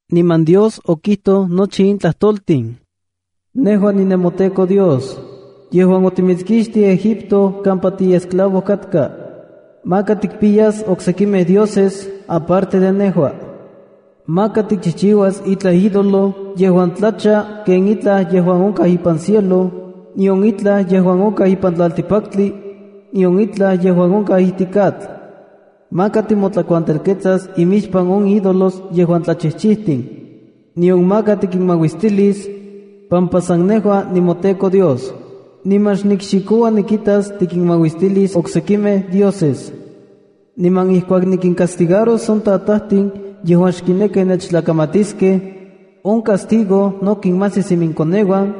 Niman Dios okijtoj nochi in tlajtoltin: “Nejua nimoTEKO Dios, yejuan otimitskixtij Egipto kampa tiesclavo katka. ’Maka tikimpiyas oksekimej dioses, aparte de nejua. ’Maka tikchijchiuas itlaj ídolo yejuan tlacha ken itlaj yejuan onkaj ipan cielo, nion itlaj yejuan onkaj ipan tlaltikpaktli, nion itlaj yejuan onkaj ijtik atl. Maka timotlakuantelketsas imixpan on ídolos yejuan tlachijchijtin, nion maka tikinmauistilis pampa san nejua nimoTEKO Dios, niman xnikxikoua nikitas tikinmauistilis oksekimej dioses. Niman ijkuak nikincastigaros on tatajtin yejuan xkinekij nechtlakamatiskej, on castigo no kinmajsis inkoneuan,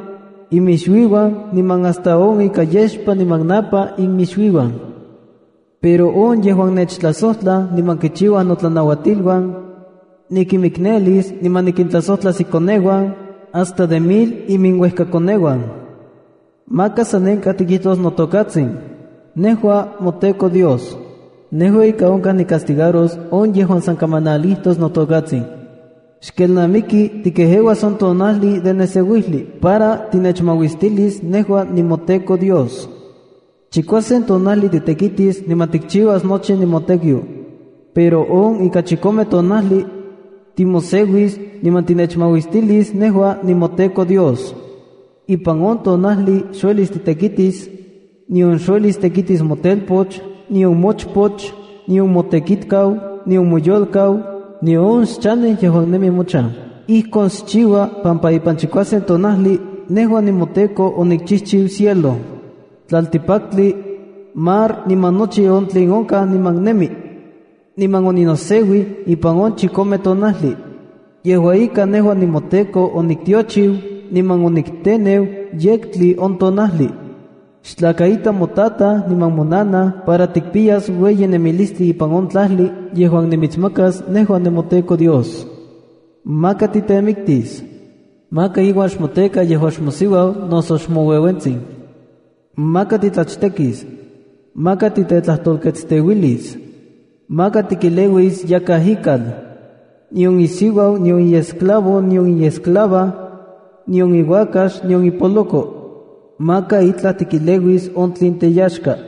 iminixuiuan, niman hasta on ika yexpa niman napa inmixuiuan. Pero on yejuan nechtlajsojtlaj niman kichiuaj notlanauatiluan, nikinmiknelis niman nikintlasojtlas inkoneuan, hasta miles teuejkakoneuan yejuan tlakatitiuij. ’Maka san nenkaj tikijtos notokatsin, nejua moTEKO Dios. Nejua ika onkaj nicastigaros on yejuan san kamanalijtos notokatsin. ’Xkelnamiki tikejeuas on tonajli de neseuijli para tinechmauistilis nejua nimoTEKO Dios. Chikuasen tonajli titekitis niman tikchiuas nochi motekiu. Pero ipan on ika chikome tonajli, timoseuis niman tinechmauistilis nejua nimoTEKO Dios. Ipan on tonajli xuelis titekitis, nion xuelis tekitis motelpoch, nion mochpoch, nion motekitkau, nion moyolkauan, nion on xchanej yejuan nemi mochan. Ijkon xchiua pampa ipan chikuasen tonajli nejua nimoTEKO onikichijchiu cielo, tlaltikpaktli, mar niman nochi on tlen onkaj niman nemi. Niman oninoseuij ipan on chikome tonajli. Yejua ika, nejua nimoTEKO oniktiochiu niman onikteneu yektli on tonajli. ’Xtlakaita motataj niman monanaj para tikpiyas ueyi nemilistli ipan on tlajli yejuan nimitsmakas nejua nimoTEKO Dios. ’Maka titemiktis. ’Maka iuan xmoteka yejuan xmosiuau noso xmoueuentsin. ’Maka titlachtekis. ’Maka titetlajtolketsteuilis. ’Maka tikeleuis yakaj ikal, nion isiuau nion iesclavo nion iesclava, nion iuakax, nion ipoloko. Maka itlaj tikeleuis on tlen teyaxka.”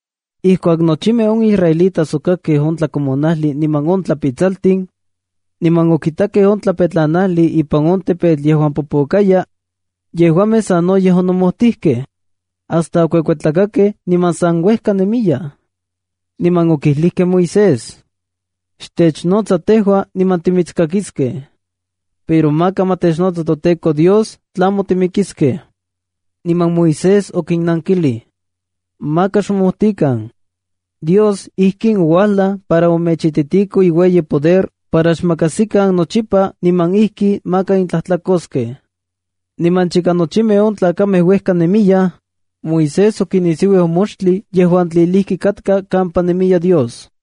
Ijkuak nochimej on israelitas okakkej on tlakomonajli niman on tlapitsaltin, niman okitakej on tlapetlanajli ipan on tepetl yejuan popokaya, yejuamej sanoyej onomojtijkej, hasta okuekuetlakakej niman san uejka nemiyaj. Niman okijlijkej Moisés: —Xtechnotsa tejua niman timitskakiskej. Pero maka ma technotsa toTEKO Dios, tlamo timikiskej. Niman Moisés okinnankilij: —Maka xmomojtikan. Dios ijkin ouajlaj para omechititiko iueyi poder para xmakajsikan nochipa niman ijki maka nentlajtlakoskej. Niman chika nochimej on tlakamej uejka nemiyaj, Moisés okinisiuij on moxtli yejuan tlilijki katka kampa nemiya Dios.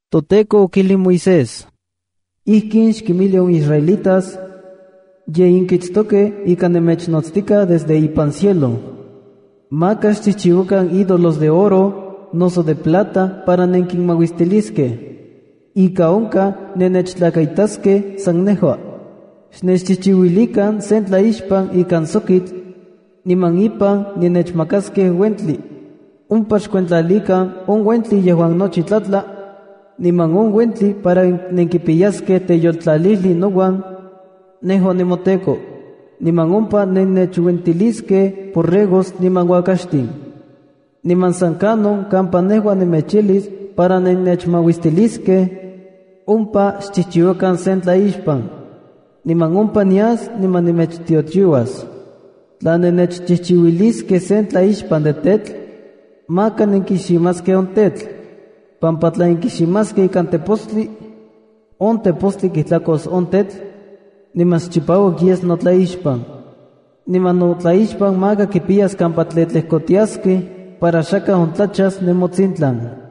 ToTEKO okijlij Moisés: “Ijkin xkinmijli on israelitas: ‘Ye nenkitstokej ika nemechnotstikaj desde ipan cielo. Maka xchijchiuakan ídolos de oro, noso de plata para nenkinmauistiliskej. Ika onkaj nenechtlakaitaskej san nejua. Xnechchijchiuilikan sen tlaixpan ikan sokitl, niman ipan nenechmakaskej uentli. Ompa xkuentlalikan on uentli yejuan nochi tlatla, niman on uentli para nenkipiyaskej teyoltlalijli nouan, nejua nemoTEKO. Niman ompa nennechuentiliskej borregos niman uakaxtin. Niman san kanon kampa nejua nemechijlis para nennechmauistiliskej, ompa xchijchiuakan sen tlaixpan. Niman ompa nias niman nemechtiochiuas. Tla nennechchijchiuiliskej sen tlaixpan de tetl, maka nenkiximaskej on tetl, pampa tla nenkiximaskej ikan tepostli, on tepostli kijtlakos on tetl, niman xchipauak yes notlaixpan. Niman notlaixpan maka kipiyas kampa tlejtlejkotiaskej para xakaj ontlachas nemotsintlan.’